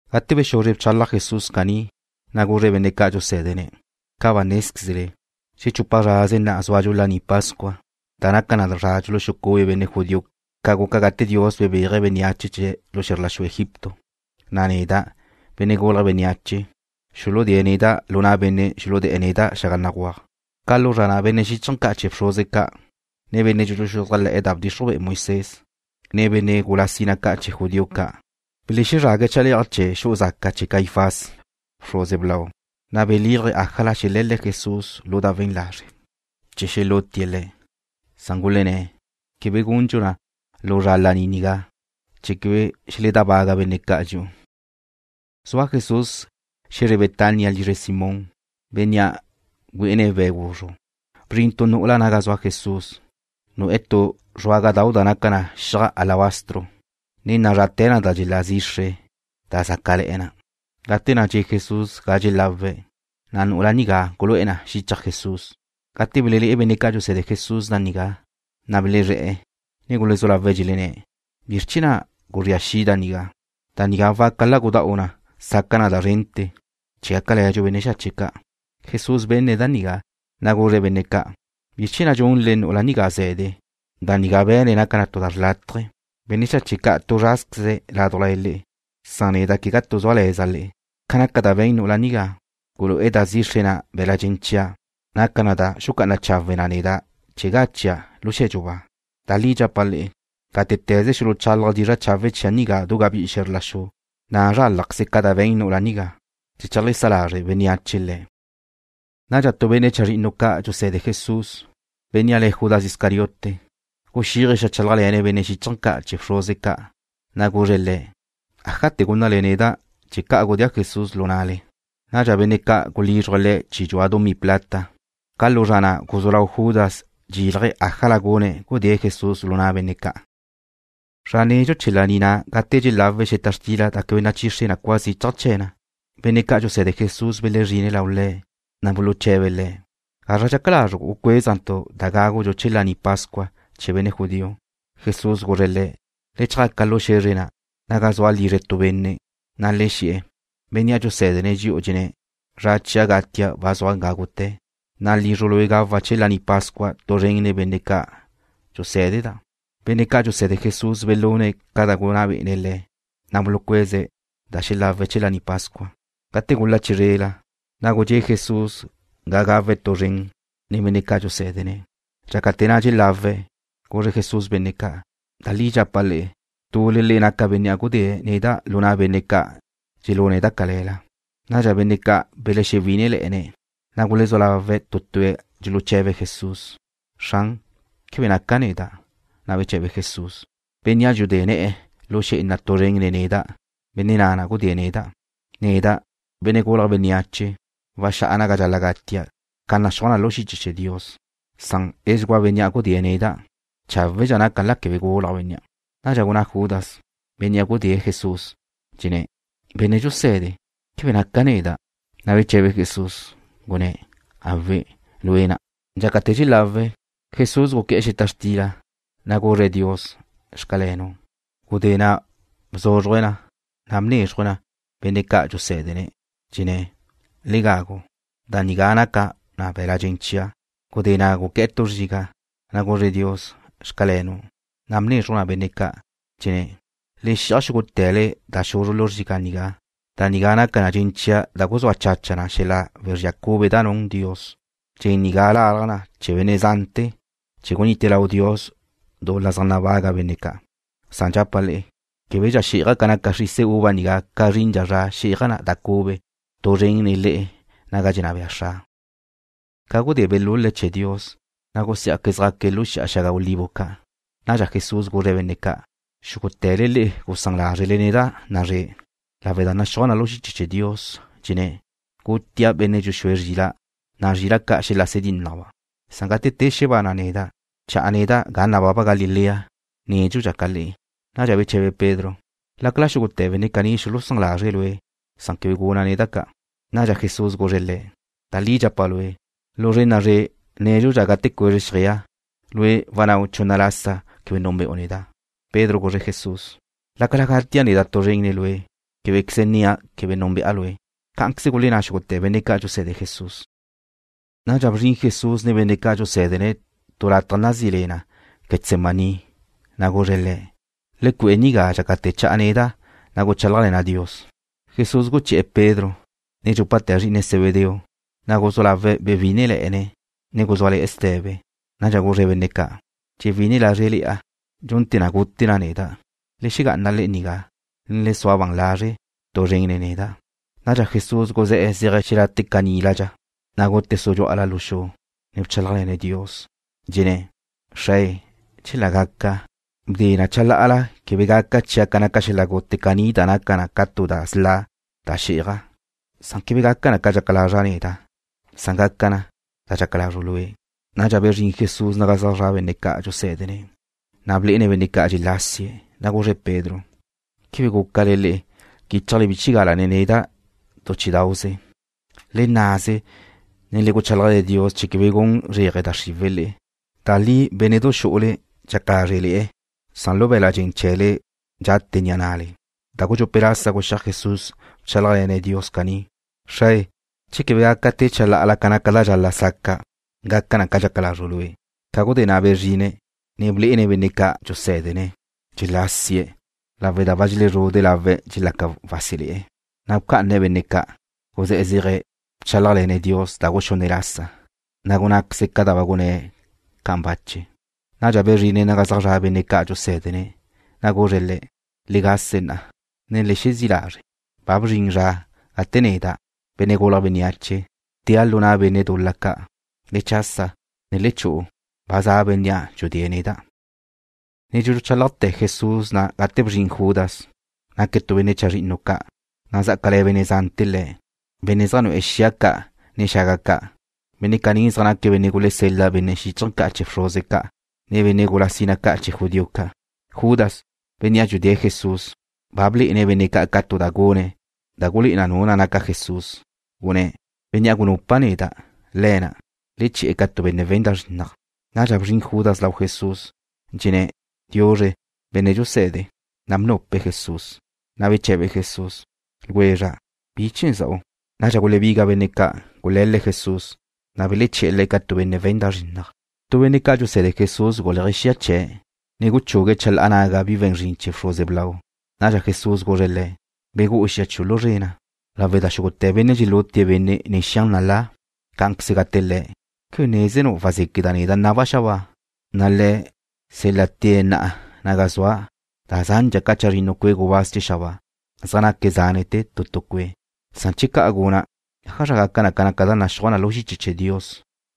Gate bexuzre bchalaj Jesús caní, na' guzre̱' benne' ca' dxusé̱dene̱': ―Ca ba nézquezle, xechupa zraze na'a súadxu Laní Pascua, da naca na zra dxuluxucube benne' judío ca guca gate Dios bebéaje̱' bénneache chee̱' lu xe̱zr la xu Egipto, na' neda', Benne' Gulje̱' Bénneache, xuludée̱' neda' lu na' benne' xuludé̱'e̱ neda' xaga béguaj. Ca lu zra na' benne' xíchaje̱ ca' chee̱ bxruze ca', ne benne' dxuluxuzájle̱'e̱ da bdxixruj Moisés, ne benne' gula sina ca' chee̱ judío ca', belezrague̱' chale'aj chee̱ xu'u zaca chee̱ Caifás, bxruze blau. Na' belílaje̱' ájala xele̱le̱' Jesús lu da we̱n lazre' chee̱ xelútie̱' Le̱'. Gulenné̱': ―Quebe gundxu na lu zra laní nigá, chee̱ quebe xeledábaga benne' ca' dxi'u. Zua Jesús xe̱zre Betania lizre Simón, bénnea' güé'ene̱' we̱' guzru'. Bzrin tu nu'ula naga zua Jesús, nu'e̱ tu zruágadau' da naca na xiaj alabastro, ne nazrate̱ na da dxelá zixre da zácale̱'e̱ na. Gate na' dxe' Jesús ga dxelawé̱', na' nu'ula nigá gulu'e̱ na xichaj Jesús. Gate belelé'e benne' ca' dxuse̱de Jesús da nigá, na' belezré̱'e̱, ne gulezú lawe̱' dxelenné̱': ―¿Bizr chee̱ na' guzría xi' da nigá? Da nigá waca la gudá'u na sí'adxu da zrente̱, chee̱ gácale̱dxu benne' xache' ca'. Jesús benne̱' da nigá, na' guzre̱' benne' ca': ―¿Bizr chee̱ na' dxunle nu'ula nigá ze̱de? Da nigá be̱ne̱' naca na tu da xrlátaje. Benne' xache' ca' tu zrázqueze̱' ládujla le'e, na' neda' quegá tu súale̱za' le'e. Ca naca da be̱n nu'ula nigá, gulu'e̱ da zixre na' be̱l-la' dxen chia', naca na da xucá'ana chawe na neda' chee̱ zra gachia' lu xe̱dxu ba. Da li dxapa' le'e, gátete̱ze xuluchálaje̱' dizra' chawe' chia' nigá du gabí'i xe̱zr la xu, na' zrálajqueze ca da be̱n nu'ula nigá, chee̱ cheajlesá lazre' bénneache le̱'. Nadxa tu benne' chazrinnu ca' dxuse̱de Jesús, bénnea' le̱' Judas Iscariote, guxíaje̱' xeajchálajle̱ne̱' benne' xíchaje̱ ca' chee̱ bxruze ca'. Guzre̱' le̱': ―¿Ájate̱ gúnnale neda' che ca' gudéa' Jesús lu na'le? Nadxa benne' ca' gulízruje̱' le̱' chi dxua dumí plata. Ca lu zra na' guzú lau Judas dxexílaje̱' ájala gune̱' gudée̱' Jesús lu na' benne' ca'. Zra nedxu chee̱ laní na' gate na' dxelawe̱' xeta xtila da quebe nachixre cua zichaj chee̱ na, benne' ca' dxuse̱de Jesús belezrine̱' lau Le̱', na' buluche̱be̱' Le̱': ―¿Gazra dxaca lazru' gucuézentu' da gágudxu chee̱ laní pascua chee̱ benne' judío? Jesús guzre̱' le̱': ―Le chjaca lu xe̱zre na', naga zua lizre tu benne', na' le xe̱'e̱: “Bennea' dxusé̱dene̱' dxi'u dxenné̱': Zra chia' gatia' ba zua gágute̱, na' lizru' lue' gawa' chee̱ Laní Pascua tu zren nen benne' ca' dxusé̱deda'.” Benne' ca' dxuse̱de Jesús belune̱' ca da gunná bé'ene̱' le̱', na' bulucueze̱' da xelawe̱' chee̱ Laní Pascua. Gate gula chizrela, na' gudxé' Jesús ga gawe̱' tu zren nen benne' ca' dxusé̱dene̱'. Dxácate̱ na' dxelawe̱', guzre Jesús benne' ca': ―Da li dxapa' le'e, tule le'e naca bénnea' gudée̱' neda' lu na' benne' ca' dxelune̱' da cale̱la. Nadxa benne' ca' belexewí'inele̱'e̱, na' gulezú lawe̱' tu tue̱' dxuluche̱be̱' Jesús: ―Xran, ¿quebe naca neda'? Na' beche̱be Jesús: ―Bénnea' dxudé ne̱'e̱ lu xé'ena tu zren nen neda', benne' na' gudée̱' neda'. Neda', Benne' Gulje̱' Bénneache, waxá'a naga dxal-la' gatia' ca naxúaj na lu xiche chee̱ Dios, san edxugúa bénnea' gudée̱' neda'. Cháwedxa naca la quebe gulaj bénnea'. Nadxa gunná Judas, bénnea' gudée̱' Jesús, dxenné̱': ―Benne' dxuse̱de, ¿quebe naca neda'? Na' beche̱be Jesús, gunné̱': ―Awe', lue' na'. Dxácate̱ dxelawe̱', Jesús guqué̱'e̱ xeta xtila, na' guzre̱' Dios: “Xcalenu'.” Gudé na' bzúzruje̱' na, na' bnézruje̱' na benne' ca' dxusé̱dene̱', dxenné̱': ―Le gagu. Da nigá naca na be̱l-la' dxen chia'. Gudé na' guqué̱'e̱ tu zriga', na' guzre̱' Dios: “Xcalenu'”, na' bnézruje̱' na benne' ca', dxenné̱': ―Le xi'aj xúgute̱le da xuzru lu zriga' nigá. Da nigá naca na dxen chia' da guzúa chacha na xel-la' wezría cube da dxun Dios. Dxen nigá lalaj na ne̱ chee̱ benne' zante̱ chee̱ gunite lau Dios dul-la zaj nabaga benne' ca'. Dxapa' le'e, québedxa xí'aja' ca naca xrise uva nigá ca zrindxa zra xí'aja' da cube tu zren nen le'e naga dxenná bea Xra'. Ca gudé belul-le̱' chee̱ Dios, na' gusiá'que̱' zjaque̱' lu Xi'a Xaga Olivo Ca'. Nadxa Jesús guzre̱' benne' ca': ―Xúgute̱le le'e gusán lázrele neda' na'a zre', lawe' da naxúaj na lu xiche chee̱ Dios, dxenné̱': “Gutia' benne' dxuxúe̱' zrila', na' zrila' ca' xelase dínnajba'.” Gate te xebana' neda', cha'a neda' ga nababa Galilea nédxudxa ca le'e. Nadxa beche̱be Pedro: ―Lácala xúgute̱ benne' caní xulusán lazre̱' Lue', quebe guna' neda' ca'. Nadxa Jesús guzre̱' le̱': ―Da li dxapa' lue', lu zre' na'a zre' nédxudxa gate cuezre xjeaj, lue' wannáu' chunna lasa quebe núnbe'u neda'. Pedro guzre̱' Jesús: ―Lácala gatia' neda' tu zren nen Lue', québequeze nnia' quebe núnbe'a Lue'. Cá'anqueze gulenná xúgute̱ benne' ca' dxuse̱de Jesús. Nadxa bzrin Jesús nen benne' ca' dxusé̱dene̱' tu lataj nazí le na Getsemaní, na' guzre̱' le̱': ―Le cue'e nigá dxácate̱ cha'a neda', guchálajle̱na' Dios. Jesús guché̱'e̱ Pedro, ne dxúpate̱ zri'ine Zebedeo, na' guzú lawe̱' bewí'inele̱'e̱ne̱' ne guzúale̱'e̱ ste̱be. Nadxa guzre̱' benne' ca': ―Dxewí'ine lázrele̱'a dxunte̱ na gute na neda'. Le xegá'ana le'e nigá, ne le sua ban lazre' tu zren nen neda'. Nadxa Jesús guzé̱'e̱ zéaje̱' xelate' caníladxa, na' gute̱' sudxú'ala lu xu, ne bchálajle̱ne̱' Dios, dxenné̱': ―Xrae, chela gaca, bde na chalá'ala quebe gaca chia' ca naca xel-la' gute caní da naca na ca tu da sla' da xí'aja'. Quebe gaca na ca dxaca lazra' neda'. Gaca na ca dxaca lazru' Lue'. Nadxa bezrín Jesús naga zaj zra' benne' ca' dxusé̱dene̱', na' blé'ene̱' benne' ca' dxelásie̱', na' guzre̱' Pedro: ―¿Quebe gúcale le'e quíchale bchigala nen neda' tu chí'idau'ze? Le nnaze, ne le guchálajle̱ Dios chee̱ quebe gun zréaje da xriwe̱' le'e. Da li bénne'du xu'ule dxaca lázre'le̱'e na, san lu be̱la' dxen chee̱le dxate ni'a na'le. Da gudxupe' lasa guxíaj Jesús bchálajle̱ne̱' Dios caní: ―Xrae, che quebe gaca te chalá'ala ca naca da dxal-la' saca', gaca na ca dxaca lazru' Lue'. Ca gudé na' bezrine̱', ne belé'ene̱' benne' ca' dxusé̱dene̱', dxelásie̱' lawe' da ba dxelezrude' lawe̱' dxelaca wásele̱'e̱. Bca'ane̱' benne' ca', guzé̱'e̱ zéaje̱' bchálajle̱ne̱' Dios da guxunne' lasa, na' gunnáqueze̱' ca da ba gunné̱' ca'an bache. Nadxa bezrine̱' naga zaj zra' benne' ca' dxusé̱dene̱', na' guzre̱' le̱': ―Le gase na'a, ne le xezí' lazre'. Ba bzrin zra gate neda', Benne' Gulje̱' Bénneache, tea' lu na' benne' dul-la ca'. Le chasa, ne le chu'u. Ba za bénnea' dxudée̱' neda'. Ne dxuchálajte̱ Jesús na' gate bzrin Judas. Naque̱' tu benne' chazrinnu ca', na' zá'acale̱ benne' zante̱ le̱', benne' zaj nu'e̱ xia ca' ne xaga ca'. Benne' caní zaj naque̱' benne' gulesel-la benne' xíchaje̱ ca' chee̱ bxruze ca', ne benne' gula sina ca' chee̱ judío ca'. Judas, bénnea' dxudée̱' Jesús, ba blé'ene̱' benne' ca' ca tu da gune̱' da gulé'e na nu na' naca Jesús. Gunné̱': ―Bénnea' gunupa' neda', Le̱' na'. Le che̱'e̱ ca tu benne' we̱n da zrinnaj. Nadxa bzrin Judas lau Jesús, dxenné̱': ―Diuzre, Benne' dxuse̱de. Na' bnupe̱' Jesús. Beche̱be Jesús: ―Ljwezra', ¿bi chee̱ za'u? Nadxa gulebiga benne' ca', gule̱le̱' Jesús, na' beleché̱'e̱ Le̱' ca tu benne' we̱n da zrinnaj. Tu benne' ca' dxuse̱de Jesús guléaje̱' xia chee̱', ne guchugue̱' chalá'a naga bi we̱n zrin chee̱ bxruze blau. Nadxa Jesús guzre̱' le̱': ―Begú'u xia chiu' lu zre na, lawe' da xúgute̱ benne' dxelute benne' nen xia nalá, cá'anqueze gate le̱'. ¿Quebe nézenu' wazéqueda' neda' naba' Xra', na' Le̱' sél-late̱' na'a naga zua' da zandxa ca chazrinnu cue' gubáz chee̱ xabáa, zaj naque̱' zánete̱ tu tu cue'? Na'a che ca'an guna', ¿ájazra gaca gaca na ca da naxúaj na lu xiche chee̱ Dios,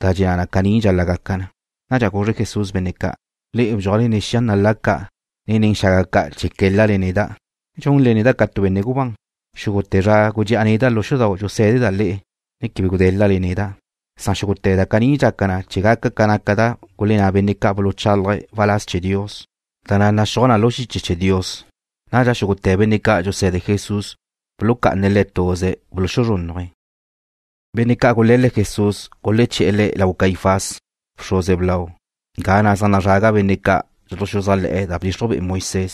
da dxenná na caní dxal-la' gaca na? Nadxa guzre Jesús benne' ca': ―Le'e bdxuajle nen xia nalá ca', ne nen xaga ca' chee̱ qué̱lale neda', dxunle neda' ca tu benne' gubán. Xúgute̱ zra gudxe'a neda' lu xudau' dxusé̱deda' le'e, ne quebe gudé̱lale neda'. Xúgute̱ da caní dxaca na chee̱ gaca na ca da gulenná benne' ca' buluchálaje̱' waláz chee̱ Dios, da na' naxúaj na lu xiche chee̱ Dios. Nadxa xúgute̱ benne' ca' dxuse̱de Jesús bulucá'ane̱' Le̱' tuze̱', buluxuzrúnnuje̱'. Benne' ca' gule̱le̱' Jesús guleché̱'e̱ Le̱' lau Caifás, bxruze blau, ga na' zaj nazraga benne' ca' dxuluxuzájle̱'e̱ da bdixruj be'e Moisés,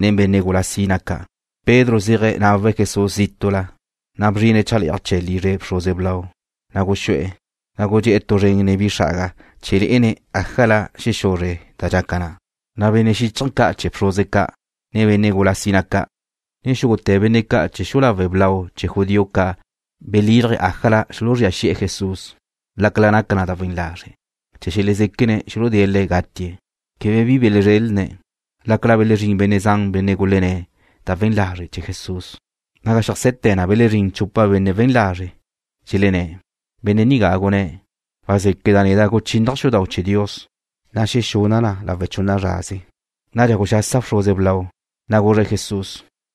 nen benne' gula sina ca'. Pedro zéaje nawe̱' Jesús zítu'la, na' bzrine̱' chale'aj chee̱ lizre bxruze blau, na' guxú'e̱, ne gudxé'e̱ tu zren nen bi xa'aga chee̱ lé'ene̱' ájala xexuzre da dxaca na'. Benne' xíchaje̱ ca' chee̱ bxruze ca', ne benne' gula sina ca', ne xúgute̱ benne' ca' chee̱ xu'u lawe' blau chee̱ judío ca' belílaje̱' ájala xuluzría xi'e̱ Jesús, lácala naca na da we̱n lazre', chee̱ xelezéquene̱' xuludée̱' Le̱' gatie̱'. Quebe bi belezrelne̱', lácala belezrín benne' zan benne' gulenné̱' da we̱n lazre' chee̱ Jesús. Naga xeajse̱te̱ na belezrín chupa benne' we̱n lazre'. Dxelenné̱': ―Benne' nigá gunné̱': “Wazéqueda' neda' guchínnaja' xudau' chee̱ Dios, na' xexuna' na lawe' chunna zraze.” Nadxa guxasa bxruze blau, na' guzre̱' Jesús: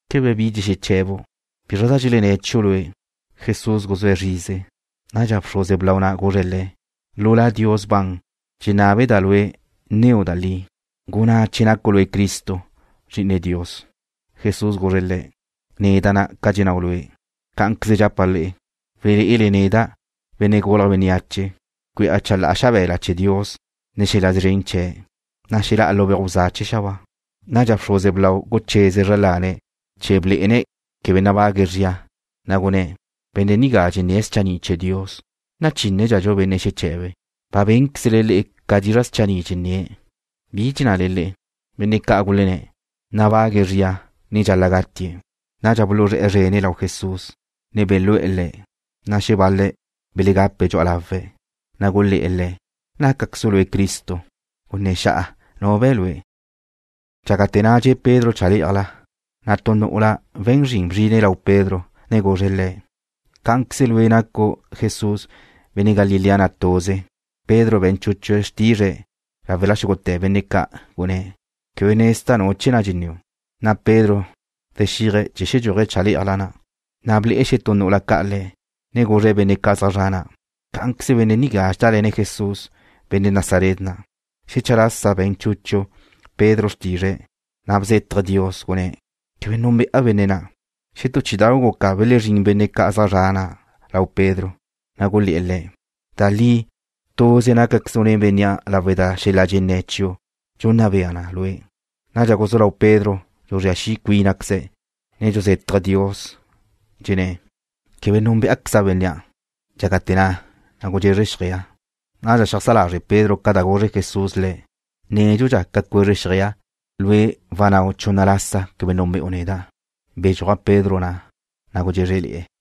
―¿Quebe bi dxexeche̱bu'? ¿Bizra da dxelenné̱' chiu' lue'? Jesús guzúe̱' zrize. Nadxa bxruze blau na' guzre̱' Le̱': ―Lu La Dios ban dxenná be'eda' lue' nneu' da li. Gunná che nacu' lue' Cristo, Zri'ine Dios. Jesús guzre̱' le̱': ―Nácaqueza' ca dxennáu' lue'. Cá'anqueze dxapa' le'e, walé'ele neda', Benne' Gulje̱' Bénneache, cue'a chalá'a xabe̱la chee̱ Dios nen xel-la' szren chee̱', na' xelá'a lu beuj bza chee̱ xabáa. Nadxa bxruze blau gucheze̱' zra lane̱' chee̱ blé'ene̱' quebe nabague̱' zria, na' gunné̱': ―Benne' nigá dxenné̱' schanni' chee̱ Dios. ¿Nachínnedxadxu benne' xeche̱be̱'? Ba bénquezle le'e ca dizra' schanni' dxenné̱'. ¿Bi dxennale le'e? Benne' ca' gulenné̱': ―Nabague̱' zria, ne dxal-la' gatie̱'. Nadxa buluzré̱'e̱ zrene̱' lau Jesús, ne belú'e̱ Le̱', na' xebal-le̱' belegape̱' dxu'a lawe̱'. Na' gulé̱'e̱ Le̱': ―¿Nácaquezu' Lue' Cristo? Gunné̱ xa'a nu be̱ Lue'. Dxácate̱ na' dxe' Pedro chalé'ajla, na' tu nu'ula we̱n zrin bzrine̱' lau Pedro ne guzre̱' le̱': ―Cá'anqueze lue' nacu' Jesús, benne' Galilea na', tuze. Pedro be̱n chúchue̱' xrtizre̱' láwela xúgute̱ benne' ca', gunné̱': ―Quebe nezda' nu chee̱ na' dxenníu'. Nadxa Pedro zexíaje̱' chee̱ xedxúaje̱' chale'aj na', na' ble'e xetú nu'ula ca' le̱', ne guzre̱' benne' ca' zaj zre̱'e̱ na': ―Cá'anqueze benne' nigá dxedále̱ne̱' Jesús, benne' Nazaret na'. Xecha lasa be̱n chúchue̱' Pedro xrtizre̱', na' bzétaje̱' Dios, gunné̱': ―Quebe núnbe'a benne' na'. Xetú chí'idau' guca belezrín benne' zaj zre̱'e̱ na' lau Pedro, na' gulé̱'e̱ le̱': ―Da li, tuze nácaquezu' nen bénnea' lawe' da xel-la' dxenné̱ chiu' dxunna bea na lue'. Nadxa guzú lau Pedro dxuzría xi' cuínazqueze̱', ne dxuzétaje̱' Dios, dxenné̱': ―Quebe núnbeaqueza' benne' na'. Dxácate̱ na' gudxezre xjeaj. Nadxa xeajsá lazre' Pedro ca da guzre Jesús le̱': Nédxudxa ca cuezre xjeaj, lue' wannáu' chunna lasa quebe núnbe'u neda'. Bedxúaj Pedro na', na' gudxézrele̱'e̱.